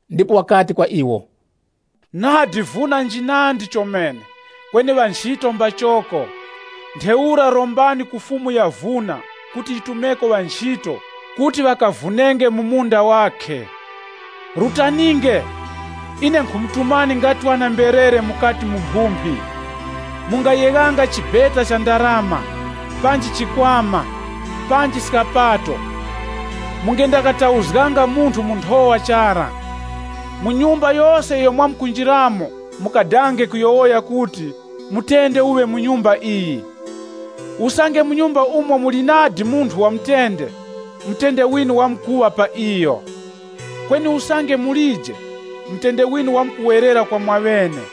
Ndipo wakati kwa iwo, “Nadi vuna njinandi chomene, kweni ŵanchito mbachoko. Ntheura rombani ku Fumu ya vuna kuti yitumeko ŵanchito kuti ŵakavunenge mu munda wakhe. Rutaninge! Ine nkhumutumani nga ŵana-mberere mukati mu mphumphi. Mungayeghanga chibeta cha ndarama, panji chikwama, panji skapato, mungendakatauzganga munthu mu nthowa chara. Mu nyumba yose iyo mwamkunjiramo mukadange kuyowoya kuti, ‘Mutende uŵe mu nyumba iyi.’ Usange mu nyumba umo muli nadi munthu wa mutende, mutende winu wamkuŵa pa iyo. Kweni usange mulije, mutende winu wamkuwerera kwa mwaŵene.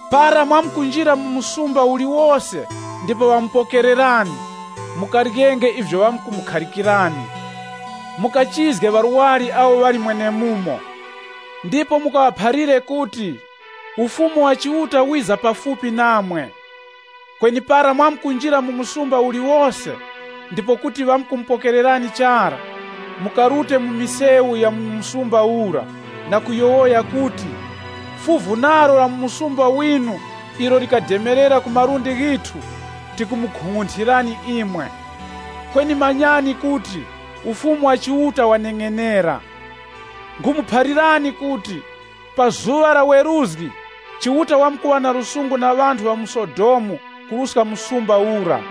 Para mwamkunjira mu muzi uliwose ndipo ŵamupokererani, mukaryenge ivyo ŵamukhalikirani. Mukachizge ŵarwari awo ŵali mwenemumo, ndipo mukaŵaphalire kuti, ‘Ufumu wa Chiuta wiza pafupi namwe.’ Kweni para mwamkunjira mu muzi uliwose ndipo kuti ŵamupokererani chara, mukarute mu misewu ya mu muzi ura na kuyowoya kuti, ‘Fuvu nalo la mu muzi winu ilo lademerera ku malundi ghithu, tikumukung'unthirani imwe. Kweni manyani kuti, Ufumu wa Chiuta waneng'enera.’ Nkhumuphalirani kuti, pa zuŵa la weruzgi, Chiuta wamkuŵazizipizgira ŵanthu ŵa mu Sodomu kuruska muzi ura.”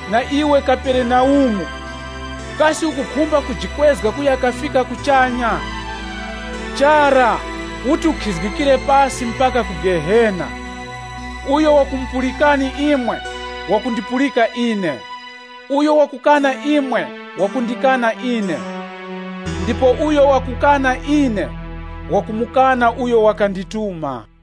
Na iwe Kaperenaumu, kasi ukukhumba kujikwezga kuya kafika kuchanya! Chara, uti ukhizgikire pasi mpaka ku Gehena.” “Uyo wakumupulikani imwe, wakundipulika ine, uyo wakukana imwe, wakundikana ine. Ndipo uyo wakukana ine, wakumukana uyo wakandituma.”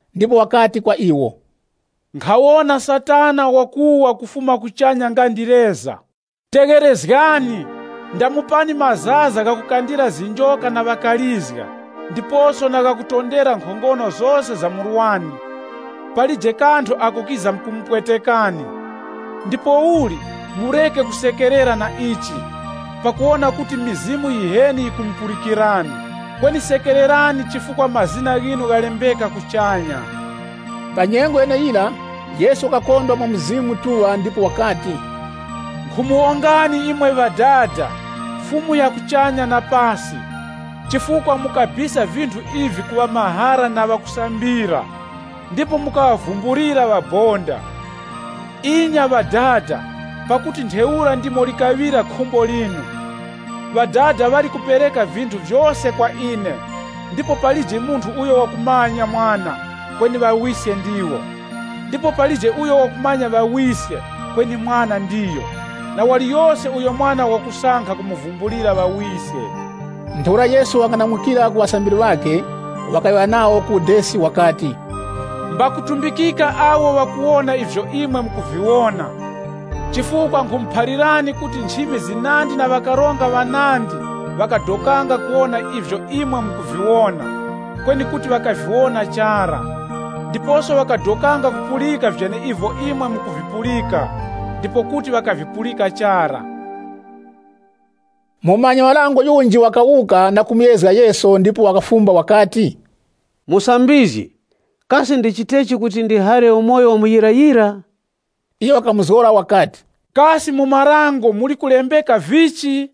Ndipo wakati kwa iwo, “Nkhawona Satana wakuwa kufuma kuchanya nga ndi leza. Tegherezgani! Ndamupani mazaza ghakukandira zinjoka na ŵakalizga, ndiposo na ghakutondera nkhongono zose za murwani. Palije kanthu ako kizamkumupwetekani. Ndipouli, mureke kusekerera na ichi, pakuwona kuti mizimu yiheni yikumupulikirani. Kweni sekererani chifukwa mazina ghinu ghalembeka kuchanya.” Pa nyengo yeneyira, Yesu wakakondwa mwa Mzimu Mutuŵa ndipo wakati, Nkhumuwongani imwe Ŵadada, Fumu ya kuchanya na pasi, chifukwa mukabisa vinthu ivi ku ŵamahara na ŵakusambira, ndipo mukaŵavumbulira ŵabonda. Inya Ŵadada, pakuti ntheura ndimo likaŵira khumbo linu. “Ŵadada ŵali kupereka vinthu vyose kwa ine, ndipo palije munthu uyo wakumanya Mwana, kweni Ŵawiske ndiwo. Ndipo palije uyo wakumanya Ŵawiske, kweni Mwana ndiyo, na waliyose uyo Mwana wakusankha kumuvumbulira Ŵawiske.” Ntheura Yesu wakang'anamukira ku ŵasambiri ŵakhe, wakayowoya nawo ku udesi wakati, “Ngakutumbikika maso agho ghakuwona ivyo imwe mukuviwona. Chifukwa nkhumuphalirani kuti nchimi zinandi na ŵakaronga ŵanandi ŵakadokanga kuwona ivyo imwe mukuviwona, kweni kuti ŵakaviwona chara. Ndiposo ŵakadokanga kupulika vyeneivyo imwe mukuvipulika, ndipo kuti ŵakavipulika chara.” Mumanyi-marango yunji wakawuka na kumuyezga Yesu. Ndipo wakafumba wakati, “Musambizgi, kasi ndichitechi kuti ndihare umoyo wa muyirayira?” Yesu wakamuzgora wakati, “Kasi mu marango muli kulembeka vichi?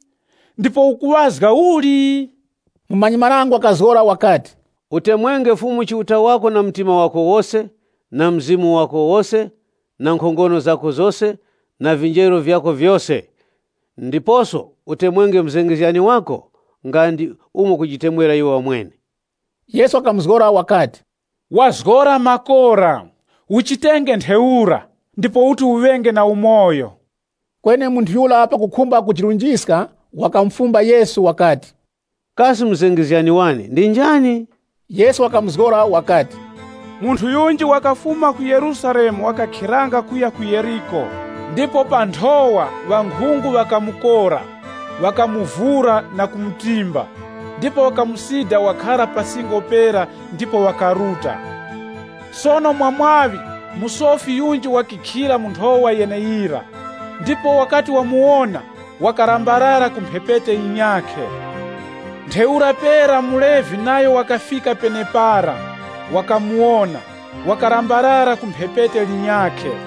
Ndipo ukuŵazga uli?” Mumanyi-marango wakazgora wakati, “Utemwenge Fumu Chiuta wako na mtima wako wose, na mzimu wako wose, na nkhongono zako zose, na vinjeru vyako vyose. Ndiposo utemwenge muzengezgani wako nga ndi umo ukujitemwera wamwene.” Yesu wakamuzgora wakati, “Wazgora makora. Uchitenge ntheura, ndipo uti uŵenge na umoyo.” Kweni munthu yura pakukhumba kujirunjiska wakamufumba Yesu wakati, “Kasi muzengezgani wane ndi njani?” Yesu wakamuzgora wakati, “Munthu yunji wakafuma ku Yerusalemu wakakhiranga kuya ku Yeriko. Ndipo pa nthowa, ŵankhungu ŵakamukora, na kumuvura, na kumutimba, ndipo ŵakamusida wakhara pa singo pera ndipo ŵakaruta. Sono mwa mwaŵi musofi yunji wakakhilira mu nthowa yeneyira, ndipo wakati wamuwona, wakalambalala ku mphepete yinyakhe. Ntheura pera muLevi nayo wakafika penepara, wakamuwona, wakalambalala ku lwegha lunyakhe.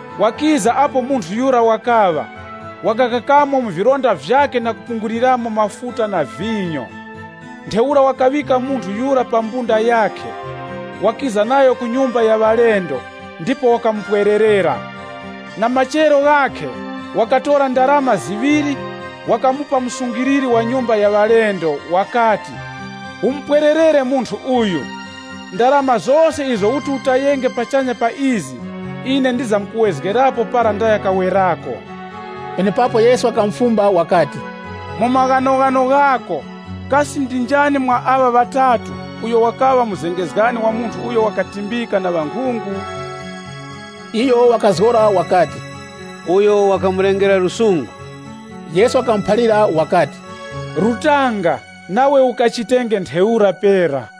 Wakiza apo munthu yura wakaŵa, wakakakamo mu vilonda vyakhe na kupungulirapo mafuta na vinyo. Ntheura wakaŵika munthu yura pa mbunda yakhe, wakiza nayo ku nyumba ya ŵalendo ndipo wakamupwererera. Na machero ghakhe, wakatora ndarama ziŵiri wakamupa msungiliri wa nyumba ya ŵalendo, wakati, ‘Umupwererere munthu uyu. Ndarama zose izo uti utayenge pachanya pa izi, ine ndizamkuwezgerapo para ndaya kawerako.’” Penepapo Yesu wakamufumba wakati, “Mu maghanoghano ghako, kasi ndi njani mwa aŵa ŵatatu, uyo wakaŵa muzengezgani wa munthu uyo wakatimbika na ŵankhungu?” Iyo wakazgora wakati, “Uyo wakamulengera lusungu.” Yesu wakamuphalira wakati, “Rutanga, nawe ukachitenge ntheura pera.”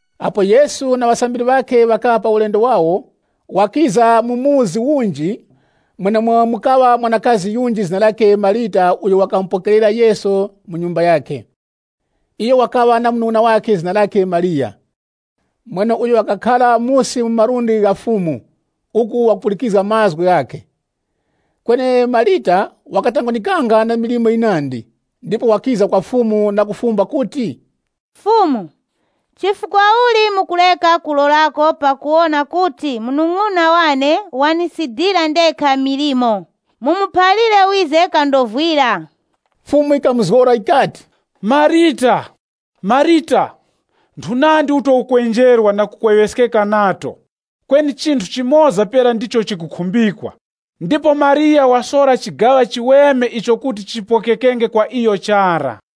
Apo Yesu na ŵasambiri ŵakhe ŵakaŵa pa ulendo wawo, wakiza mu chikaya chinji, umo mukaŵa mwanakazi yunji zina lakhe Marita uyo wakamupokerera Yesu mu nyumba yakhe. Iyo wakaŵa na munung'una wakhe zina lakhe Mariya, mweneuyo wakakhara musi mu malundi gha Fumu, uku wakupulikizga mazgu ghakhe. Kweni Marita wakatangwanikanga na milimo yinandi, ndipo wakiza kwa Fumu na kufumba kuti, “Fumu, chifukwa uli mukureka kupwelererako pakuwona kuti munung'una wane wandisidira ndekha milimo? Mumuphalire wize kandovwire!” Fumu yikamuzgora yikati, “Marita! Marita! Nthunandi uto ukwenjerwa na kukweŵeskeka nato. Kweni chinthu chimoza pera ndicho chikukhumbikwa. Ndipo Mariya wasora chigaŵa chiweme icho kuti chipokekenge kwa iyo chara.”